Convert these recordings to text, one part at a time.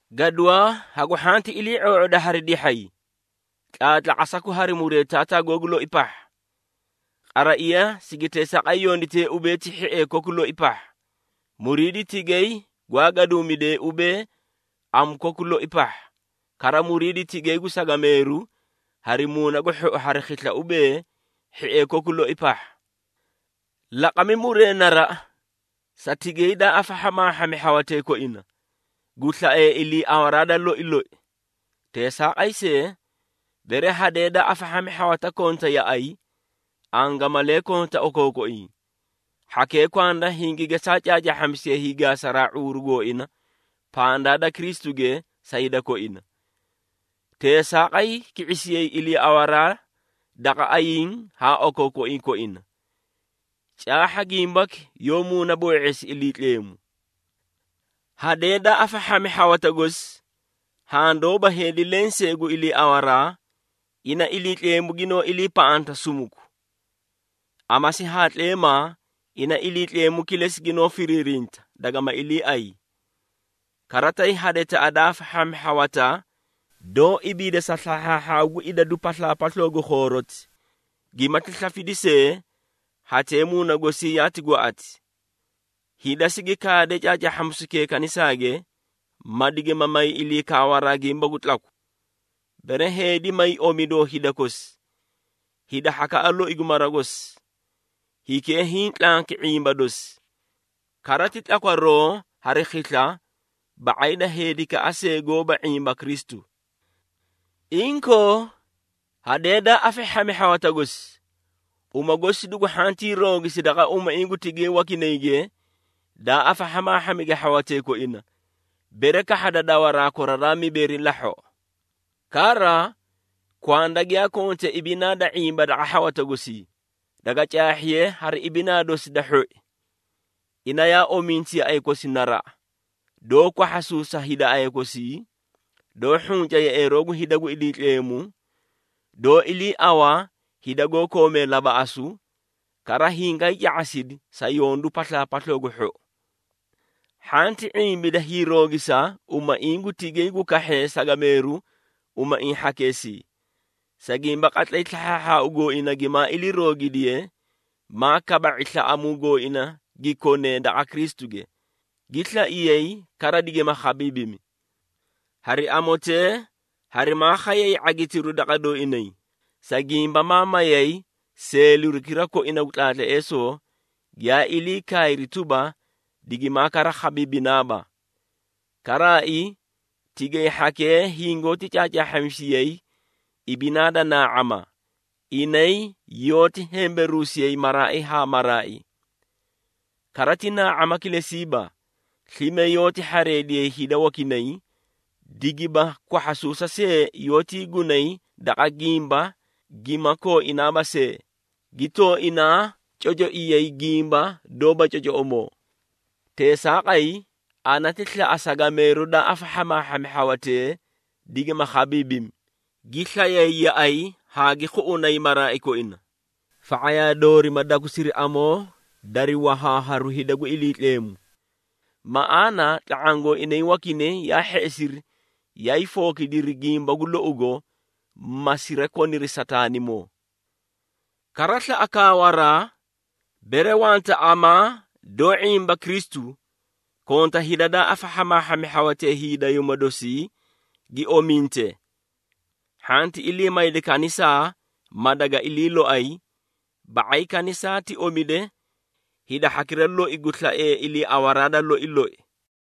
Gaduwaa hagu hhanti ilii⁄oo⁄oda hari dihhay. Tlaatlaqasaku hari muree taataa googu loi pahha. Qaraiya sigi teesaaqay yonditee ubee ti, hhiee koku loi pahha, muriidi tigay gwaa gadumidee ubee, amu koku loi pahha, kara muriidi tigay gu sagameeru hari muuna gu hhou hari khisla ubee, hhiee koku loi pahha. Laqami muree naraꞌa, sa tigay daa afahhamaahhami hhawatee koina, gu slaee iliiawaraa da loi loi. Teesaaqay see, bere hadee daa afahhami hhawata konta yaꞌay, angamalee konta okookoiĩ, hhakee kwanda hingi gesaa caacaahhamisiyee hiigaasaraa ⁄uuru gooina pandaa da Kristuge sa hida koina. Teesaaqay ki⁄isiyay iliiawaraa daqa ayiĩ haa okookoiĩ koina. Caahha gimbaki yoó muunaboo⁄eesi Iliitleemu. Hadee daa afahhami hhawata gosi, haã doóba heedi lenseei gu iliiawaraa, ina Iliitleemu ginoó iliipaꞌanta sumuku. Amasi haa tleemaa ina Iliitleemu kilesi ginoó firiirinta, dagama iliiay. Kara tay hadetaꞌa daa afahhami hhawata, doó ibiida sa slahhaahhaau gu idadu paslaapasloo gu khooroti, gimati slafidi see, hatee muuna gosii yaati gwaꞌati. Hida sigi kaade caacaahhamisukee kanisaage, ma digima may ilii kaawaraa gimba gu tlaku. Bere heedi may omidoo hida kosi, hida hhakaꞌa loi gu mara gosi, hikee hiĩ tlanki ⁄imba dosi, kara ti tlakwaroo hari khisla, ba⁄ay da heedikaꞌa see goóba ⁄imba Kristu. Inkoo, hadee daa afahhami ha hhawata gosi, uma gosi dugu hhantii roogisi daqa umaiĩ gu tigay wakinayge daa afahhamaahhamige hhawatee koina, bere kahhada dawaraa koraraa mibeeri lahhoꞌo. Kara kwanda giyaa konte ibinaa da ⁄imba daqa hhawata gosii, daga caahhiye hari ibinaa dosi da hhoi. Ina yaa ominti yaꞌay kosi naraꞌa, doó kwahhasuusa hida aya gosii, doó hhunca yeꞌeeroo gu hida gu Iliitleemu, doó iliiaꞌawa hida goó koomee labaꞌasu, kara hingaay ca⁄asidi sa yondu paslaapasloo gu hhou. Hhanti ⁄imbida hiiroogisa umaiĩ gu tigay gu kahhee sagameeru umaiĩ hhakeesii, sa gimba qatlay slahhaahhaau gooina gimaa hiiroogidiye maa kaba⁄i slaꞌamuu gooina gi konee daqa Kristuge, gi slaiyay kara digima khabiibimi. Hari amotee harimaa khayay ⁄agitiru daqa dooinay, sa gimba ma mayay seelirukira koina gu tlaatleesoo, giyaa ilii kaayri tuba, digimaa kara khabiibinaaba. Karaai, tigay hhakee hingoóti caacaahhamisiyay ibinaa da naa⁄ama, inay yoóti hemberuusiyay maraai haa maraai. Kara ti naa⁄ama kilesiiba, slime yoóti hhareediyay hida wakinay, digiba kwahhasuusa see yoótii gunay daqa gimba gima kooinaaba see, gi tooinaa cocoiyay gimba doóba cocoꞌomoo. Teesaaqay ana ti slaꞌa sagameeru da afahhamaahhami hhawatee, digima khabiibimi, gi slayay yaꞌay haa gi khuꞌunay maraai koina, fa⁄ayaa doori ma dakusiri amoo dari wahaaharu hida gu Iliitleemu. Maꞌaana tla⁄aã gooinay wakinay yaa hheꞌesiri yaay fookidiri gimba gu lougo, ma sirakoniri Sataanimoo. Kara slaꞌa kaawaraa, bere wanta amaa doó ⁄imba Kristu, konta hida daa afahhamaahhami hhawatee hiidayuuma dosii, gi ominte. Hhanti ilii mayda kanisaa, ma daga ilii loay, ba⁄ay kanisaa ti omide hida hhakira loi gu slaiyeei iliiawaraa da loi loi.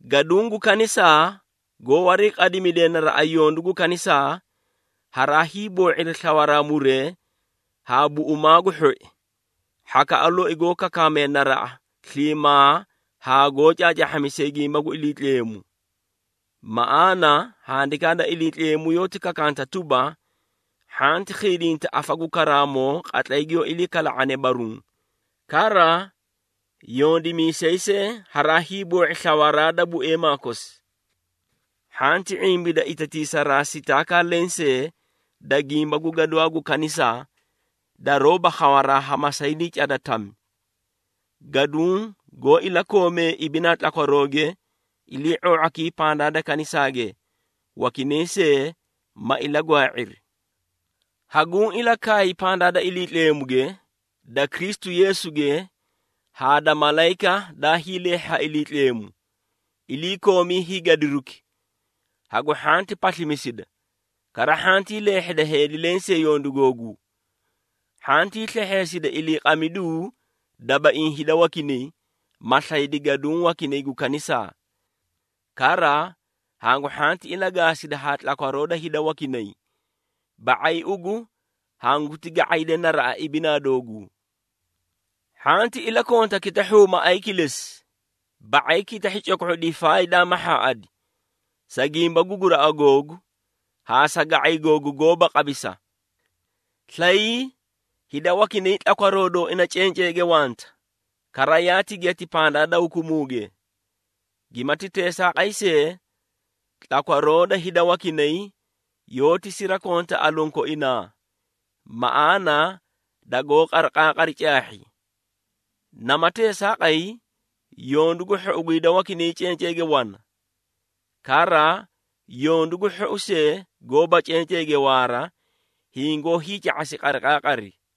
Gaduũ gu kanisaa goó wariiqadimidee naraꞌa yondu gu kanisaa, haraa hiiboo⁄iri slawaraa muree ha buꞌumaa gu hhoi, hhakaꞌa loi goó kakaamee naraꞌa sliimaa haa goó caacaahhamisee gimba gu Iliitleemu. Maꞌaana Handikaa da Iliitleemu yoóti kakanta tuba, “Hhanti khiidinta afa gu karaamoo qatlay giyoó ilii kala⁄ane baruũ,” kara “Yondimiisay see haraa hiiboo⁄i slawaraa da bueemaa kosi.” Hhanti ⁄imbida itatiisaraa sitaakaa lensee da gimba gu gaduwaa gu kanisaa, daroóba khawaraa ha masaydii cada, tami. Gaduũ goó ilakoomee ibinaa tlakwarooge, ilii⁄oo⁄akii pandaa da kanisaage, wakinay see ma ilagwaa⁄iri. Haguũ ilakaay pandaa da Iliitleemuge, da Kristu Yeesuge haa da malayika daa hiileehhi ha Iliitleemu, iliikoomi hiigadiruki hagu hhanti paslimisida, kara hhantii leehheda heedi lensee yondu googuu. Hhantii slehheesida iliiqamiduu dabaiĩ hida wakinay, ma slaydi gaduũ wakinay gu kanisaa. Kara hangu hhanti ilagaasida haa tlakwaroo da hida wakinay, ba⁄ay ugu hanguti ga⁄ayde naraꞌa ibinaa dooguu. Hhanti ilakonta kitahhuu maꞌay kilesi, ba⁄ay kitahhi coko⁄o difaay daa mahhaaꞌadi, sa gimba gu guraꞌa googu haa sa ga⁄ay googu goóba qabisa. Slayii hida wakinay tlakwaroo dooina cenceege wanta, kara yaati giyati pandaa da hukumuuge. Gimati teesaaqay see, tlakwaroo da hida wakinay, yoóti sirakonta aluũ koinaa, maꞌaana dagoó qariqaaqari caahhi. Nama teesaaqay, yondu gu hhou gu hida wakinay cenceege wana. Kara yondu gu hhou see goóba cenceege waara, hingoó hiica⁄asi qariqaaqari.